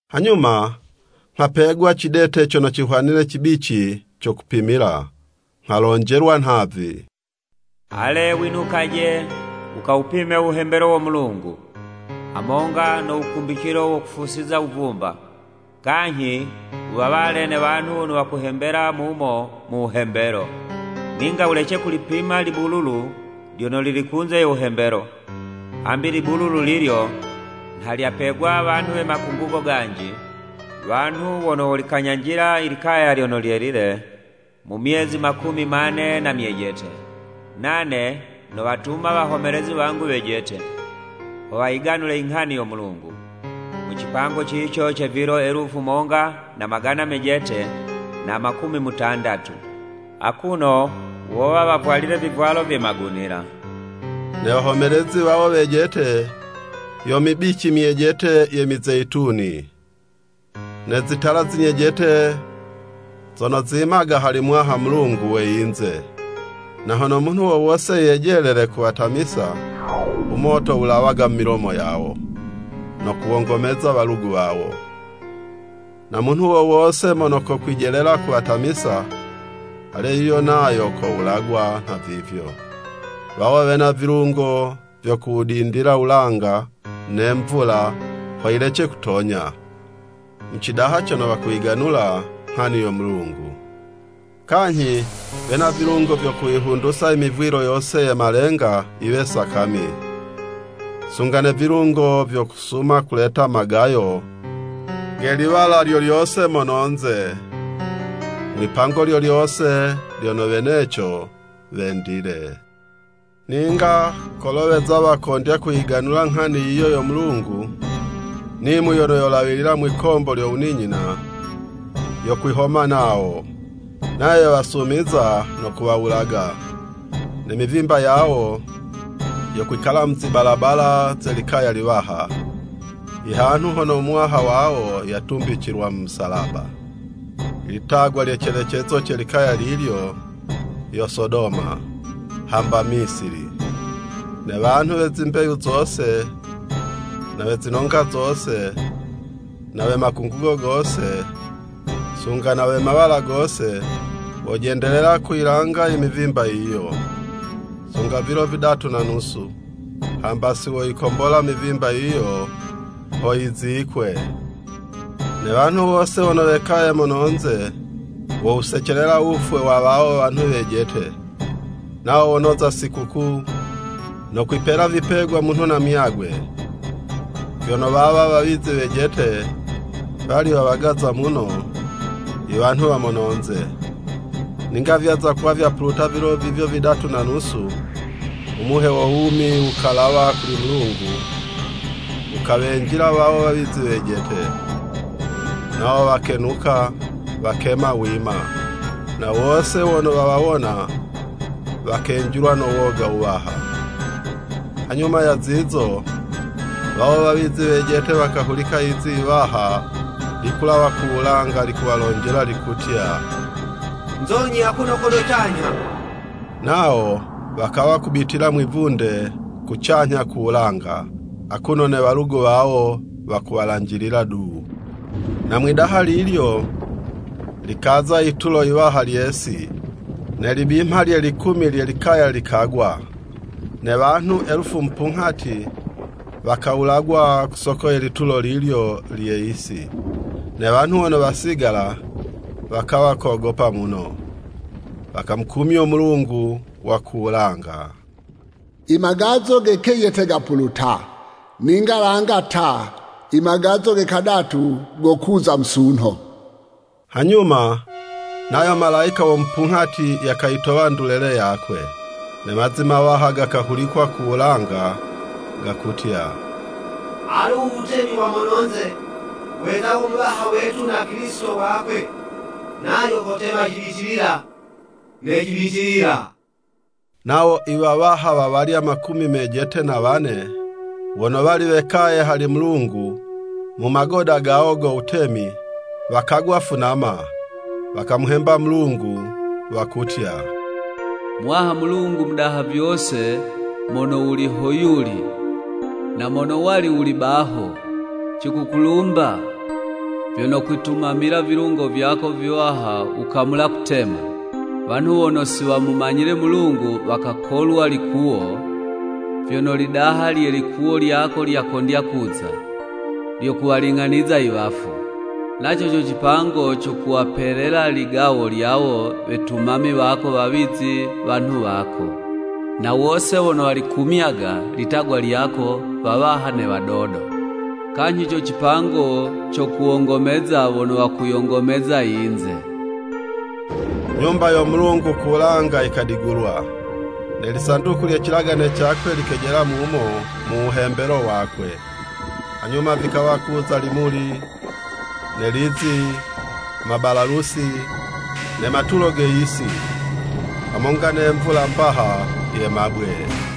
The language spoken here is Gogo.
Hanyuma nghapegwa cidete cono cihwanile cibici co kupimila, nghalonjelwa nhavi, “Ale winukaje wukawupime u wuhembelo wo Mulungu, hamonga no wukumbicilo wo kufusiza wuvumba, kanyhi wuwawale ne wanhu wono wakuhembela mumo mu wuhembelo. Ninga wulece kulipima libululu lyono lili kunze yo wuhembelo, hambi libululu lilyo, nha lyapegwa wanhu we makungugo ganji, wanhu wono wolikanyanjila i likaya lyono lyelile mu myezi makumi mane na myejete. Nane nowatuma wahomelezi wangu wejete, ho wayiganule i nghani yo Mulungu, mu cipango cico ce vilo elufu monga na magana mejete na makumi mutandatu, akuno wowa wavwalile vivwalo vye magunila.” Ne wahomelezi wawo wejete, yo mibici myejete ye mizeyituni, ne zitala zinyejete zono zimaga hali Muwaha Mulungu we yinze. Na hono munhu wo wose yejelele kuwatamisa, u moto wulawaga mu milomo yawo no kuwongomeza walugu wawo. Na munhu wo wose mono kokwijelela kuwatamisa, ale, yuyo nayo kowulagwa nhavivyo. Wawo wena vilungo vyo kuwudindila wulanga, ne mvula ho yilece kutonya, mu cidaha cono wakuyiganula nghani yo Mulungu. Kanyhi wena vilungo vyo kuyihundusa i mivwilo yose ye malenga yiwe sakami, sunga ne vilungo vyo kusuma kuleta magayo ge liwala lyo lyose mono'nze, mwi'pango lyo lyose lyono weneco wendile. Ninga kolo weza wakondya kuyiganula nghani yiyo yo Mulungu, nimu yono yolawila mwikombo lyo wuninyina, yokwihoma nawo, nayo yowasumiza no kuwawulaga. Ne mivimba yawo, yokwikala mu zibalabala ze likaya liwaha, ihanhu hono u Muwaha wawo yatumbicilwa mu musalaba, i litagwa lye colecezo ce likaya lilyo, yo Sodoma, hamba Misili. Ne wanhu we zimbeyu zose, na we zinonga zose, na we makungugo gose, sunga na we mawala gose, wojendelela kuyilanga i mivimba yiyo, sunga vilo vidatu na nusu, hamba siwoyikombola mivimba yiyo ho yizikwe. Ne wanhu wose wono wekaye mono'nze, wowusecelela wufwe wa wawo wanhu wejete. Nawo wonoza sikukuu, no kwipela vipegwa munhu na muyagwe, vyono wawa wawizi wejete wali wawagaza muno, i wanhu wa mononze. Ninga vyaza kuwa vyapuluta vilo vivyo vidatu na nusu, u muhe wo wumi wukalawa kuli Mulungu wukawenjila wawo wawizi wejete, nawo wakenuka wakema wima, na wose wono wawawona, wakenjilwa no woga wuwaha. Hanyuma, ya zizo, wawo wawizi wejete, wakahulika lizi yiwaha likulawa ku wulanga, likuwalonjela likutya, “Nzonyi akuno kono canyha!” Nawo wakawa kubitila mwivunde kucanyha ku wulanga, akuno ne walugu wawo wakuwalanjilila du. Na mwi'daha lilyo, likaza yitulo yiwaha lye'si, ne libimha lye likumi lye likaya likagwa. Ne wanhu elufu mupunghati wakawulagwa ku soko ye litulo lilyo lye yisi. Ne wanhu wono wasigala, wakawa kogopa muno, wakamukumyo Mulungu wa ku wulanga. I magazo ge kejete gapuluta, ninga langa ta! I magazo ge kadatu gokuza musunho. Hanyuma, nayo malayika wo mupunghati yakayitowa ndulele yakwe. Ne mazi mawaha gakahulikwa ku wulanga gakutya, “Alu u wutemi wa mononze, weza wo Muwaha wetu na Kilisito wakwe. Nayo kotema cibitilila ne cibitilila.” Nawo i wawaha wa walya makumi mejete na wane, wono wali wekaye hali Mulungu, mu magoda gawo go wutemi, wakagwa funama, wakamuhemba Mulungu, wakutya, “Muwaha Mulungu Mudaha vyose mono wuli ho yuli, na mono wali wuli baho! Cikukulumba, vyono kwitumamila vilungo vyako viwaha wukamula kutema! Wanhu wono si wamumanyile Mulungu wakakolwa likuwo, vyono lidaha lye likuwo lyako lyakondya kuza, lyo kuwaling'aniza i wafu. Naco co cipango co kuwapelela ligawo lyawo wetumami wako wawizi wanhu wako, na wose wono walikumyaga, litagwa lyako, wawaha ne wadodo. Kanyhi co cipango co kuwongomeza wono wakuyongomeza yinze.” I Nyumba yo Mulungu ku wulanga yikadigulwa, ne lisanduku lye cilagane cakwe, likejela mumo mu wuhembelo wakwe. Hanyuma vikawa kuza limuli, ne lizi, mabalalusi, ne matulo ge yisi, hamonga ne mvula mbaha ye mabwe.